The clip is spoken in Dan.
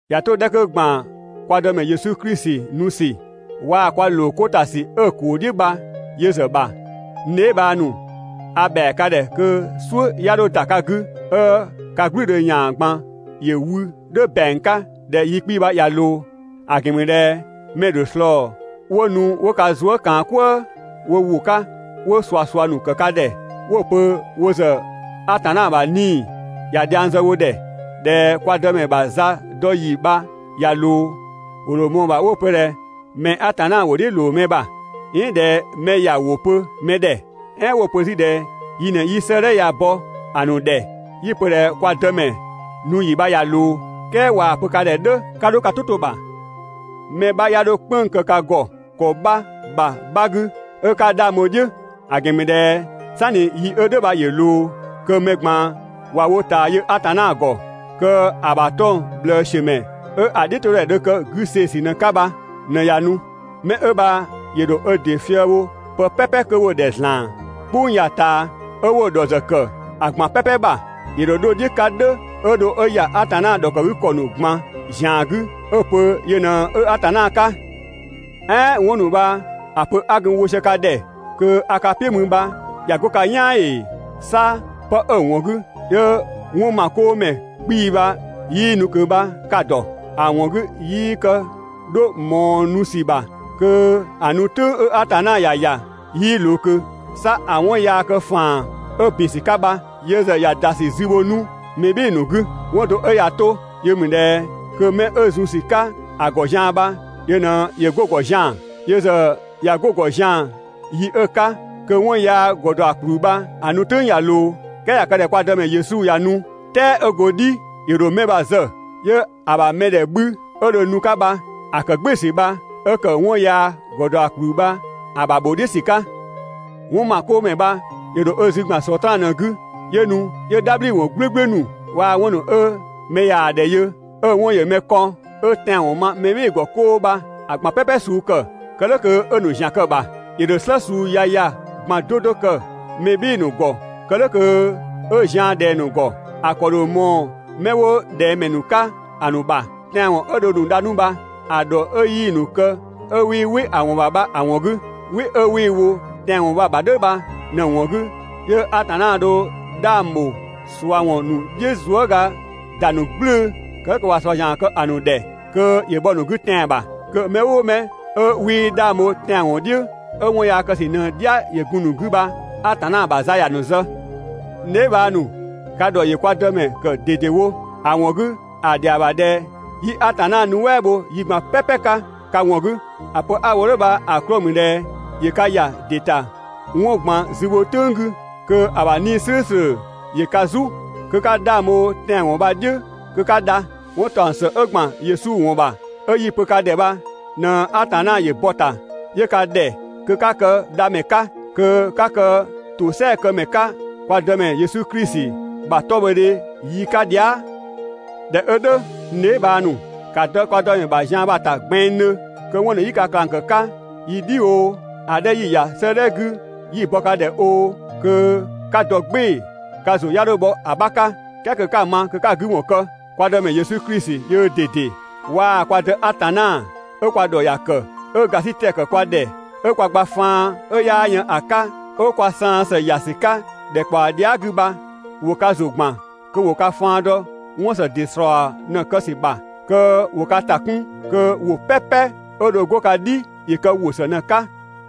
꞊Ya 'to‑ 'dhɛ 'kö ‑gban kwa Dëmɛ Yesu Klisi nu ‑sü waa‑ kwa ‑lookota ‑sü 'ö‑ ‑kuu "dhiʋ̈ bha yö ‑zë ‑bha, n dheebhang ‑nu, a ‑bhɛa ka ‑dhɛ kö "suʋ̈ 'ya 'dho ‑da ka 'gü 'ö ka "gblʋ̈ʋ̈dhö ‑yan ꞊gban ‑yö wü "dhʋ̈ ‑bɛang 'ka ꞊dhɛ yi 'kpii‑ bha ꞊ya ꞊loo. ‑A ‑gɛn ‑mü ꞊dhɛ mɛ‑ ‑dho ꞊slɔɔ 'wo nu 'wo ka zuë" ꞊kaan "kwëë wo ‑wʋ 'ka 'wo ꞊suasua ‑nu ‑kë ka ‑dhɛ 'wo‑ pö wo ‑zë Atanna ‑bha 'Nii‑ ꞊ya dhiang zë wo ‑dhɛ, ꞊dhɛ kwa Dëmɛ ‑bha za dɔ ‑yi bha ꞊ya ꞊loo, ‑wo ‑dho ꞊mɔɔ‑ ‑bha 'wo‑ pö ꞊dhɛ mɛ‑ Atanna ‑wʋ "dhiʋ̈ ꞊loo mɛ ‑bha, "ɛɛn ꞊dhɛ mɛ ‑ya ‑wʋ pö mɛ ‑dhɛ, "ɛɛn 'wo‑ pö 'zü ꞊dhɛ yi ꞊në 'yi 'sëëdhɛ bɔ‑ ‑nu ‑dhɛ 'yi‑ pö ꞊dhɛ kwa Dëmɛ nu ‑yi bha ꞊ya ꞊loo. "Kɛɛ ꞊waa‑ pö ka ‑dhɛ "dhʋ̈, 'ka 'dho ka "tʋ 'to‑ ‑bha! Mɛ 'bha 'ya 'dho "kpënng‑ kë ka ‑gɔ ‑kɔ 'bha ‑bha 'bha 'gü 'ö 'ka 'dhang bho‑ "dhiʋ̈. ‑A ‑gɛn ‑mü ꞊dhɛ "sanni yi 'ö "dhʋ̈ bha ‑yö ꞊loo, kö mɛ ꞊gban ꞊wa wo ꞊taa yö Atanna ‑gɔ, kö‑ ‑bha 'tɔng‑ ꞊bhlëësiömɛ 'ö‑ "dhiʋ̈todhɛ dho kë 'güseesü ꞊në‑ 'ka bha ꞊në ꞊ya nu. Mɛ 'ö bha ‑yö ‑dho ö ‑dɩ fië‑ bho pë "pɛpɛ 'kö 'wo‑ ‑dhɛ ‑zlan "kpʋng ya‑ ꞊taa, 'ö 'wo‑ ‑dhɔ ‑zë ‑kë ‑a ꞊gban "pɛpɛ ‑bha. ‑Yö ‑dho 'dho‑ "dhiʋ̈ 'ka "dhʋ̈ 'ö dho 'ö ‑ya Atanna ‑dhɔkëgükɔ ‑nu ꞊gban ‑zian 'gü 'ö‑ pö yö ꞊në 'ö Atanna 'ka. "Ɛɛn 'wɔn ‑nu bha‑ pö 'a gun‑ wo sië ka ‑dhɛ kö a ka "piʋ̈ mü bha ꞊ya 'go ka "yaan ‑ee? 'Sa 'pë 'ö‑ ‑wɔn 'gü 'yö 'wɔnmakoomɛ 'kpii‑ bha 'yii nu ꞊kö bha ka‑ ‑dɔ. ‑A ‑wɔn 'gü 'yii kë 'dho ꞊mɔɔ nu ‑sü ‑bha kö ‑a nu "tʋ̈ng 'ö Atanna ‑ya ‑ya 'yii ꞊loo ꞊kö. 'Sa ‑a 'wɔn yaa kë ‑faan 'ö ‑bin ‑sü 'ka bha, yö ‑zë ꞊ya ‑da ‑sü zü bho 'nu mɛ "bhɩɩ‑ ‑nu 'gü. 'Wɔn do 'ö ꞊ya 'to yö ‑mü ꞊dhɛ kö 'mɛ 'ö zun ‑sü 'ka‑ ‑gɔ zian‑ bha yö ꞊në ‑yö 'go‑ ‑gɔ zian‑. Yö ‑zë ꞊ya 'go‑ ‑gɔ zian‑ yi 'ö‑ 'ka kö 'wɔn yaa ‑gɔdɔakpluu bha‑ nu "tʋ̈ng ꞊ya ꞊loo. "Kɛɛ ꞊ya kë ꞊dhɛ kwa Dëmɛ Yesu ꞊ya nu, "tɛɛ 'ö go‑ "dhi ‑yö ‑dho mɛ bha‑ zë, 'yö‑ ‑bha mɛdhɛ 'bhü 'ö dho nu‑ 'ka bha‑ ‑kë "gbɩɩ‑ ‑sü bha 'ö ‑kë 'wɔn yaa ‑gɔdɔakpluu bha‑ ‑bha ‑bho "dhiʋ̈ ‑sü 'ka. 'Wɔnmakoomɛ bha‑ ‑dho ö zü ‑gban Sɔtraan ꞊në‑ 'gü, 'yö nu 'yö "dhabhliwɔn "gblʋ̈gblʋ̈ ‑nu waa‑ 'wɔn ‑nu 'ö mɛ yaa‑ ‑dhɛ yö 'ö‑ 'wɔn ‑yö mɛ kɔn, 'ö tɛanwɔn ma mɛ "bhɩɩ‑ ‑gɔ 'koo bha‑ ꞊gban "pɛpɛ suu ‑kë, kë "dhʋ̈ kö 'ö‑ ‑nu ‑zian kë‑ ‑bha. ‑Yö ‑dho "slë suu yaya ꞊gban 'do 'do kë mɛ "bhɩɩ‑ ‑nu ‑gɔ kë "dhʋ̈ kö 'ö zian ꞊dhɛng‑ ‑nu ‑gɔ. ‑A ‑kɔ ‑dho ꞊mɔɔ 'mɛ 'wo ꞊dhɛngmɛ ‑nu 'ka ‑a ‑nu ‑bha, tɛanwɔn 'ö dho‑ ‑nu dha 'nu bha‑ ‑dhɔ 'ö 'yii‑ ‑nu kë 'ö 'wii "wɩ‑ ‑wɔn ‑bha bha‑ ‑wɔn 'gü. "Wɩ 'ö 'wii‑ wo tɛanwɔn bha‑ ‑bha "dhʋ̈ bha ꞊në ‑wɔn 'gü, 'yö Atanna dho 'dhang ‑bho ꞊sua ‑wɔn ‑nu "dhiʋ̈ zuëga ‑da ‑nu "gblʋ̈ʋ̈‑, kë "dhʋ̈ kö ꞊wa ꞊sua ‑zian kë‑ ‑nu ‑dhɛ kö ‑yö bhɔ‑ ‑nu 'gü tɛan‑ ‑bha. Kö mɛ "ʋʋ mɛ 'ö 'wii 'dhang bho tɛanwɔn "dhiʋ̈ 'ö 'wɔn yaa kë ‑sü ꞊në‑ "dhia ‑yö gun‑ ‑nu 'gü bha Atanna ‑bha za ‑ya ‑nu zë. N dheebhang ‑nu, ka ‑dhɔ ‑yö kwa Dëmɛ ‑kë ꞊dedewo, ‑a ‑wɔn 'gü ‑a ‑dhɛa ‑bha ꞊dhɛ 'yi Atanna nuɛ" bho yi ꞊gban "pɛpɛ 'ka ka ‑wɔn 'gü. ‑A pö 'a‑ wo "dhʋ̈ bha‑ 'klɔɔ‑ ‑mü ꞊dhɛ ‑yö ka ‑ya ‑dɩ ‑ta 'wɔn ꞊gban zübho "tʋ̈ng 'gü kö‑ ‑bha 'Nii‑ "slʋ̈ʋ̈slʋ̈ ‑yö ka "zu, kö 'ka 'dhang bho tɛanwɔn bha‑ "dhiʋ̈ kö 'ka dha. 'Wɔn ‑taɔng ‑së 'ö ‑gban Yesu ‑wɔn ‑bha, 'ö 'yi‑ pö ka ‑dhɛ bha ꞊në Atanna ‑yö bɔ‑ ‑ta, 'yö ka ‑dhɛ kö 'ka kë dha ‑mɛ 'ka, kö 'ka kë ‑tosɛakëmɛ 'ka kwa Dëmɛ Yesu Klisi ‑bha 'tɔbhɔdhe yi 'ka dhia". ꞊Dhɛ 'ö "dhʋ̈, n dheebhang ‑nu, ‑ka dɔ kwa Dëmɛ ‑bha zian bha‑ ‑ta gbɛnngdhö, kö 'wɔn ‑nu 'yi ka ꞊klang ‑kë 'ka yi "dhi oo, ‑a 'dhɛ 'yi‑ ‑ya 'sëëdhɛ 'gü 'yi‑ bɔ ka ‑dhɛ oo, kö 'ka dɔ "gbɩɩ‑ ka ‑zʋ 'ya 'dho bhɔ‑ 'bha 'ka, "kɛɛ kö 'ka‑ ma kö 'ka‑ 'gü ‑wɔn kë. Kwa Dëmɛ Yesu Klisi yöö ꞊dede, waa‑ kwa Dë Atanna, 'ö kwa ‑dhɔ ‑ya ‑kë, 'ö ‑gasitɛ ‑kë kwa ‑dhɛ 'ö kwa gba faan 'ö 'yaa yën ‑a 'ka, 'ö kwa saan ‑së ‑ya ‑sü 'ka ‑dhɛkpaɔ dhia" 'gü bha, ‑wo ka ‑zʋ ‑gban kö ‑wo ka faan dɔ 'wɔn ‑së ‑dɩ ‑slɔɔ ꞊në‑ kë ‑sü ‑bha, kö ‑wo ka ‑ta 'kun kö ‑wʋ "pɛpɛ 'ö dho 'go ka "dhi ‑yö kë ‑wʋ ‑së ꞊në‑ 'ka.